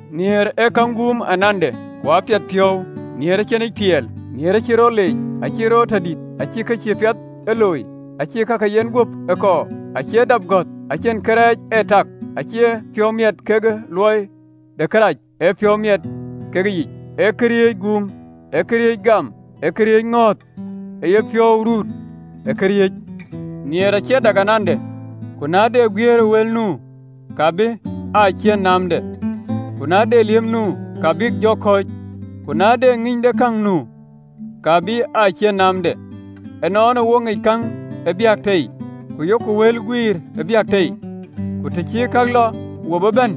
Nhiëër ee käŋ guum anande, ku apiɛth piɔ̈u, nhiëër acïnic tiɛɛl, nhiëër acïï rɔt ee leec, acïï rɔt ee tɔ dït, acïï kë cïï piɛth ee looi, acïï ka ke yenguöp ee kɔɔr, acie dap gɔ̈th, acïn kërɛɛc ee tak, acïï piɔ̈u ee miɛt kekë luɔi de kërac, ee piɔ̈u miɛt kekë yic. Ee këriëëc guum, ee këriëëc gam, ee këriëëc ŋɔ̈ɔ̈th, ee yepiɔ̈u ruut në këriëëc. Nhiëër acie dak anande. Ku na de guiëër ë wël nu, ka bï aa ciën naamde, ku na de liëp nu, ka bïk jɔ kɔ̈ɔ̈c, ku na de ŋïnydekäŋ nu, ka bï aa ciën naamde. Ënɔɔnë wo ŋic käŋ ë biäk tei, ku yok wël guiir ë biäk tei: ku të cï kë cï dikëdik bɛ̈n,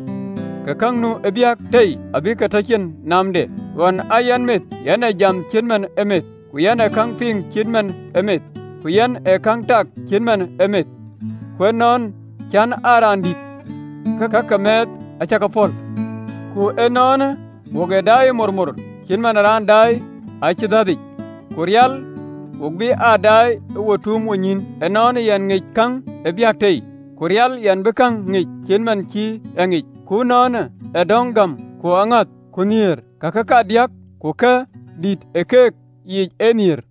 ke kë nu ë biäk tei abï tɔ cïn naamde. Ɣɔn aa yɛn meth, yɛn ee jam cït man ë meth, ku yɛn ee käŋ piŋ cït man ë meth, ku yɛn ee käŋ tak cït man ë meth, ku ënɔn cän aa raan dït, ke ka ke mɛɛth acä ke pɔ̈l. Ku ënɔɔnë, wok ee daai ëmormor, cït man ë raan ë daai acidhathic, ku rial, wo bï aa daai ke wo tuum wonyïïn. Ënɔɔnë yɛn ŋic käŋ ë biäk tei, ku rial yɛn bï käŋ ŋic cït man cï en a ŋic. Ku ënɔɔnë adɔ̈ŋ gäm, ku aŋäth, ku nhiëër, kake kedhie, ku kë dïït ë kake yiic ee nhiëër.